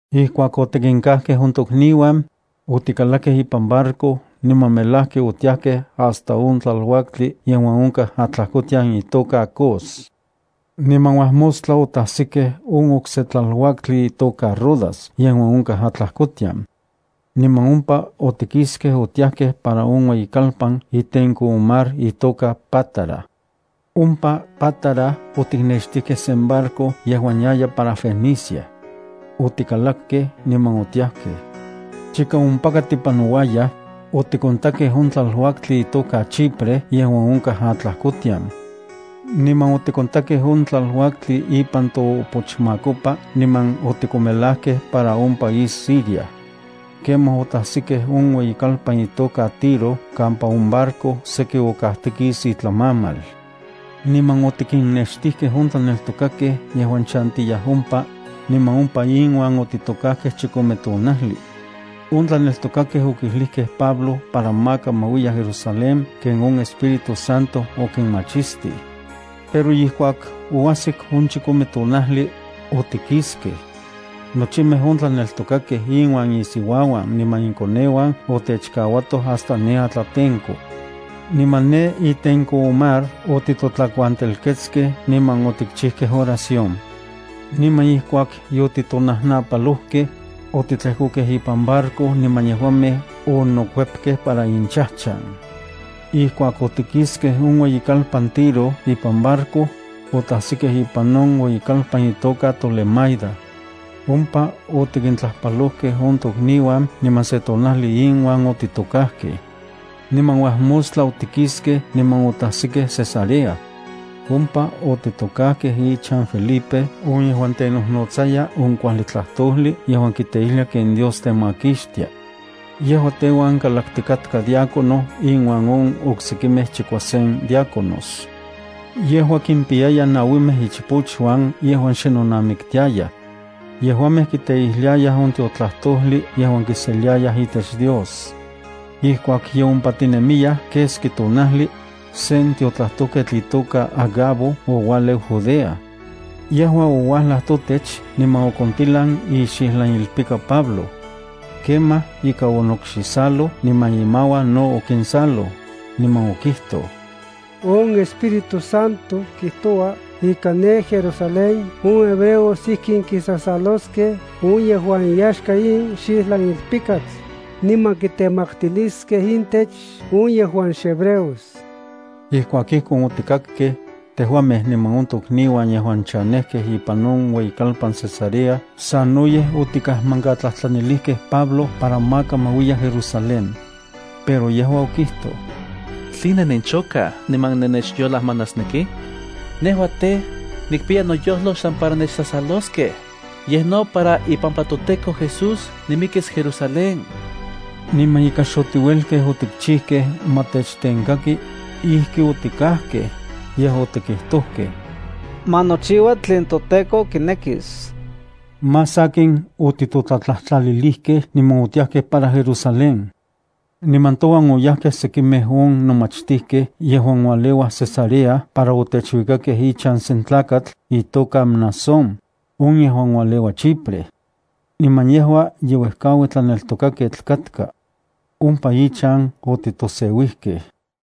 Ijkuak otikinkajkej on tokniuan, otikalakej ipan barco niman melajki otiajkej hasta on tlaluaktli yejuan onkaj atlajkotian itoka Cos. Niman uajmostla otajsikej on okse tlaluaktli itoka Rodas yejuan onkaj atlajkotian. Niman ompa otikiskej otiajkej para on ueyikalpan itenko on mar itoka Pátara. Ompa Pátara otiknextijkej sen barco yejuan yaya para Fenicia. Otikalakej niman otiajkej. Chika ompaka tipanouayaj, otikontakej on tlaluaktli itoka Chipre yejuan onkaj atlajkotian. Niman otikontakej on tlaluaktli ipan toopochmakopa niman otikomelajkej para on país Siria. Kemaj otajsikej on ueyikalpan itoka Tiro kampa on barco okajtikis itlamamal. Niman otikinnextijkej on tlaneltokakej yejuan chantiyaj ompa, niman ompa inuan otitokajkej chikome tonajli. On tlaneltokakej okijlijkej Pablo para maka ma uiya Jerusalén ken on Espíritu Santo okinmachistij. Pero ijkuak oajsik on chikome tonajli, otikiskej. Nochimej on tlaneltokakej inuan insiuauan niman inkoneuan otechkauatoj hasta ne atlatenko. Niman ne itenko on mar otitotlakuantelketskej niman otikchijkej oración. Niman ijkuak yotitonajnapalojkej, otitlejkokej ipan barco niman yejuamej onokuepkej para inchajchan. Ijkuak otikiskej on ueyikalpan Tiro ipan barco, otajsikej ipan on ueyikalpan itoka Tolemaida. Ompa otikintlajpalojkej on tokniuan niman se tonajli inuan otitokajkej. Niman uajmostla otikiskej niman otajsikej Cesarea. Ompa otitokajkej ichan Felipe on yejuan tenojnotsaya on kuajli tlajtojli yejuan kiteijlia ken Dios temakixtia. Yejua teuan kalaktikatka diácono inuan on oksekimej chikuasen diáconos. Yejua kimpiyaya nauimej ichpochuan yejuan xe nonamiktiayaj. Yejuamej kiteijliayaj on tiotlajtojli yejuan kiseliayaj itech Dios. Ijkuak ye ompa tinemiyaj keski tonajli, sen tiotlajtojketl itoka Agabo oualeu Judea. Yejua ouajlaj totech niman okontilan ixijlanilpika Pablo. Kemaj ika onokxisaloj niman imauan no okinsaloj, niman okijtoj: —On Espíritu Santo kijtoua ika ne Jerusalén on hebreos ijkin kisasaloskej on yejuan iyaxka in xijlanilpikatl, niman kitemaktiliskej intech on yejuan xhebreos. Ijkuak ijkon otikakkej, tejuamej niman on tokniuan yejuan chanejkej ipan on ueyikalpan Cesarea sanoyej otikajmankatlajtlanilijkej Pablo para maka ma uiya Jerusalén. Pero yejua okijtoj: —¿Tline nenchokaj niman nennechyolajmanasnekij? Nejua tej, nikpiya noyojlo xsan para nechsasaloskej, yej no para ipampa toTEKO Jesús nimikis Jerusalén. Niman ika xotiuelkej otikchijkej ma techtenkaki, ijki otikajkej, yej otikijtojkej: —Ma nochiua tlen toTEKO kinekis. Más sakin otitotlatlajtlalilijkej niman otiajkej para Jerusalén. Niman touan oyajkej sekimej on nomachtijkej yejuan ualeuaj Cesarea para otechuikakej ichan sen tlakatl, itoka Mnasón, on yejuan ualeua Chipre. Niman yejua ye uejkaui tlaneltokaketl katka. Ompa ichan otitoseuijkej.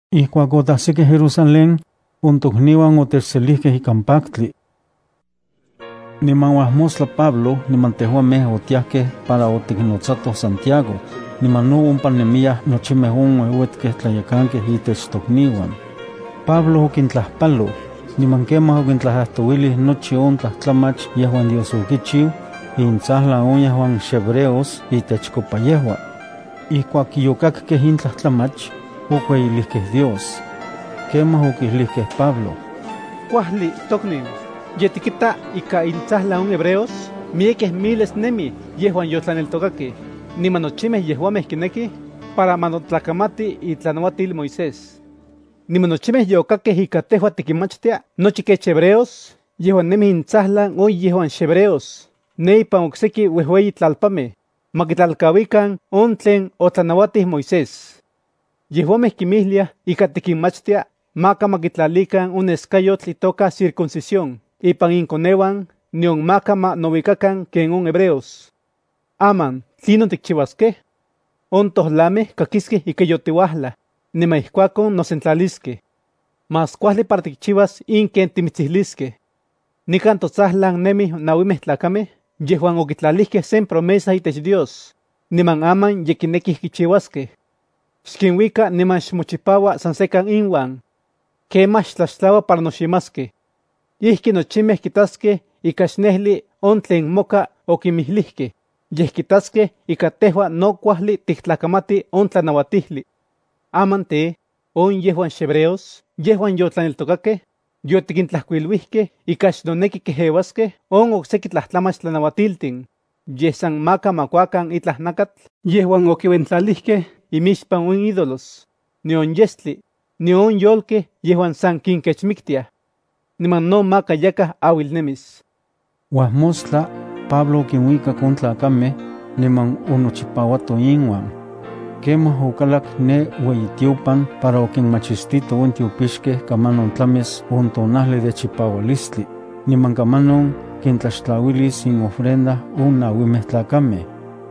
Ijkuak otajsikej Jerusalén, on tokniuan otechselijkej ikan paktli. Niman uajmostla Pablo niman tejuamej otiajkej para otiknotsatoj Santiago, niman no ompa nemiyaj nochimej on ueuetkej tlayekankej itech tokniuan. Pablo okintlajpaloj, niman kemaj okintlajtlajtouilij nochi on tlajtlamach yejuan Dios okichiu, intsajlan on yejuan xhebreos itechkopa yejua. Ijkuak yokakkej in tlajtlamach, okueyilijkej Dios. Kemaj okijlijkej Pablo: —Kuajli, tokniu, ye tikita ika intsajlan on hebreos miyek miles nemij yejuan yotlaneltokakej, niman nochimej yejuamej kinekij, para ma notlakamati itlanauatil Moisés. Niman nochimej yokakkej ika tejua tikinmachtia nochi kech hebreos yejuan nemij intsajlan on yejuan xhebreos ne ipan okseki ueyitlalpanmej, ma kitlalkauikan on tlen otlanauatij Moisés. Yejuamej kinmijliaj ika tikinmachtia maka ma kitlalikan on neskayotl itoka circuncisión ipan inkoneuan nion maka ma nouikakan ken on hebreos. Aman, ¿tlinon tikchiuaskej? On tojlamej kakiskej ika yotiuajlaj, niman ijkuakon nosentlaliskej. Más kuajli para tikchiuas in ken timitsijliskej. Nikan totsajlan nemij nauimej tlakamej yejuan okitlalijkej sen promesa itech Dios, niman aman ye kinekij kichiuaskej. Xkinuika niman xmochipaua san sekan inuan. Kemaj xtlaxtlaua para noximaskej. Ijki nochimej kitaskej ika xnejli on tlen moka okinmijlijkej, yej kitaskej ika tejua no kuajli tiktlakamati on tlanauatijli. Aman tej, on yejuan xhebreos yejuan yotlaneltokakej, yotikintlajkuiluijkej ika xnoneki kejeuaskej on okseki tlajtlamach tlanauatiltin, yej san maka ma kuakan itlaj nakatl yejuan okiuentlalijkej imixpan on ídolos, nion yestli, nion on yolkej yejuan san kinkechmiktiaj. Niman no maka yakaj auilnemis. Uajmostla, Pablo okinuikak on tlakamej, niman onochipauato inuan. Kemaj okalak ne ueyitiopan para okinmachistito on tiopixkej kamanon tlamis on tonajli de chipaualistli, niman kamanon kintlaxtlauilis inofrenda on nauimej tlakamej.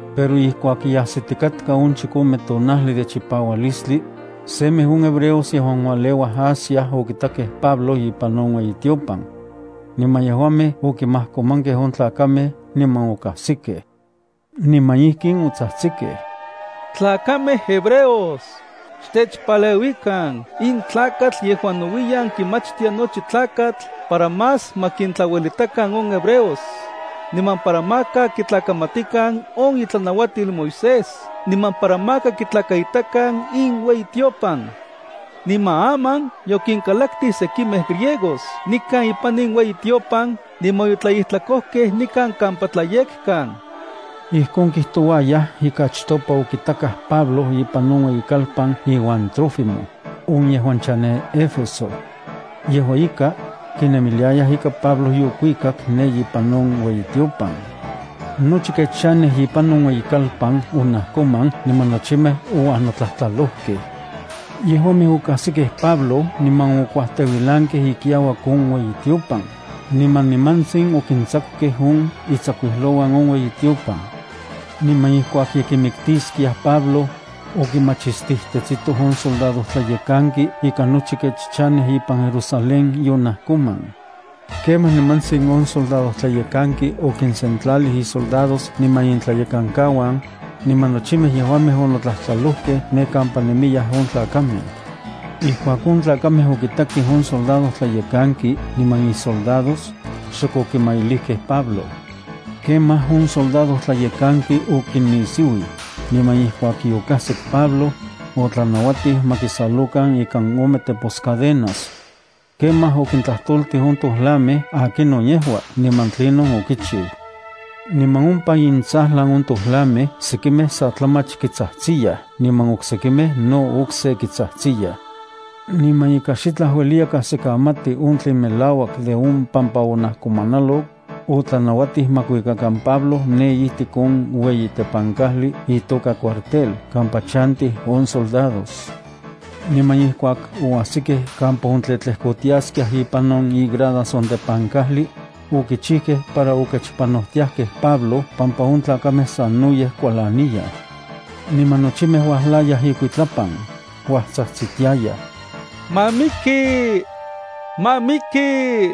Pero ijkuak ye ajsitikatka on chikome tonajli de chipaualistli, semej on hebreos yejuan ualeuaj Asia okitakej Pablo ipan on ueyitiopan. Niman yejuamej okimajkomankej on tlakamej niman okajsikej. Niman ijkin otsajtsikej: —¡Tlakamej hebreos, xtechpaleuikan! In tlakatl yejuan nouiyan kimachtia nochi tlakatl para más ma kintlauelitakan on hebreos, niman para maka kitlakamatikan on itlanauatil Moisés niman para maka kitlakaitakan in ueyitiopan. Niman aman yokinkalaktij sekimej griegos nikan ipan in ueyitiopan niman yotlaijtlakojkej nikan kampa tlayekkan. Ijkon kijtouayaj ika achtopa okitakaj Pablo ipan on ueyikalpan iuan Trófimo, on yejuan chanej Éfeso. Yejua ika, kinemiliayaj ika Pablo yokuikak ne ipan on ueyitiopan. Nochi kech chanej ipan on ueyikalpan onajkoman niman nochimej ouajnotlajtlalojkej. Yejuamej okajsikej Pablo niman okuajteuilankej ikiauak on ueyitiopan, niman nimantsin okintsakukej on itsakuijlouan on ueyitiopan. Niman ijkuak ye kimiktiskiaj Pablo, okimachistijtetsitoj on soldadojtlayekanki ika nochi kech chanej ipan Jerusalén yonajkoman. Kemaj nimantsin on soldadojtlayekanki okinsentlalij isoldados niman intlayekankauan niman nochimej yejuamej onotlajtlalojkej ne kampa nemiyaj on tlakamej. Ijkuak on tlakamej okitakej on soldadojtlayekanki niman isoldados, xok okimailijkej Pablo. Kemaj on soldadojtlayekanki okinisiuij, niman ijkuak yokajsik Pablo, otlanauatij ma kisalokan ikan ome teposcadenas. Kemaj okintlajtoltij on tojlamej akinon yejua niman tlinon okichiu. Niman ompa intsajlan on tojlamej sekimej sa tlamach kitsajtsiyaj niman oksekimej no okse kitsajtsiyaj. Niman ika xitlaj ueliya kajsikamati on tlen melauak de on pampa onajkomanalok, otlanauatij ma kuikuakan Pablo ne ijtik on ueyi tepankajli itoka cuartel kampa chantij on soldados. Niman ijkuak oajsikej kampa ontletlejkotiaskiaj ipan igradas on tepankajli, okichijkej para okechpanojtiajkej Pablo pampa on tlakamej sanoyej kualaniyaj. Niman nochimej uajlayaj ikuitlapan, uajtsajtsitiayaj: —¡Ma miki! ¡Ma miki!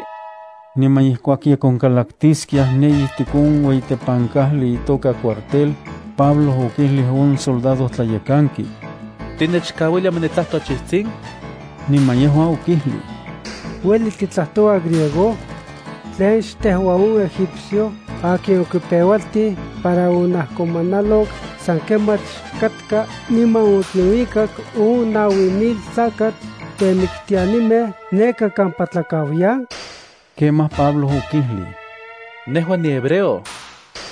Niman ijkuak ye konkalaktiskiaj ne ijtik on ueyi tepankajli itoka cuartel, Pablo okijlij on soldadojtlayekanki: —¿Tinechkauilia ma nitlajto achijtsin? Niman yejua okijlij: —¿Ueli titlajtoua griego? ¿Tlen xtejua on egipcio akin okipeualtij para onajkomanalok san kemach katka niman okinuikak on naui mil tlakatl temiktianimej neka kampa tlakauyan? Kemaj Pablo okijlij: —Nejua nihebreo.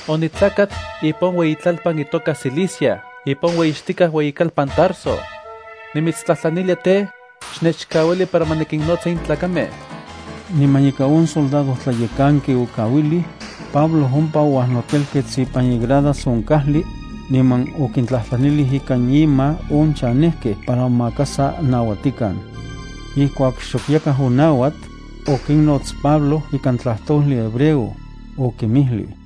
Onitlakat ipan on ueyitlalpan itoka Cilicia ipan on ueyixtikaj ueyikalpan Tarso. Nimitstlajtlanilia tej, xnechkauili para ma nikinnotsa in tlakamej. Niman ika on soldadojtlayekanki okauilij, Pablo ompa ouajnotelkets ipan igradas on kajli, niman okintlajtlanilij ikan ima on chanejkej para maka sa nauatikan. Ijkuak xok yakaj onauat, okinnots Pablo ikan tlajtojli hebreo, okinmijlij: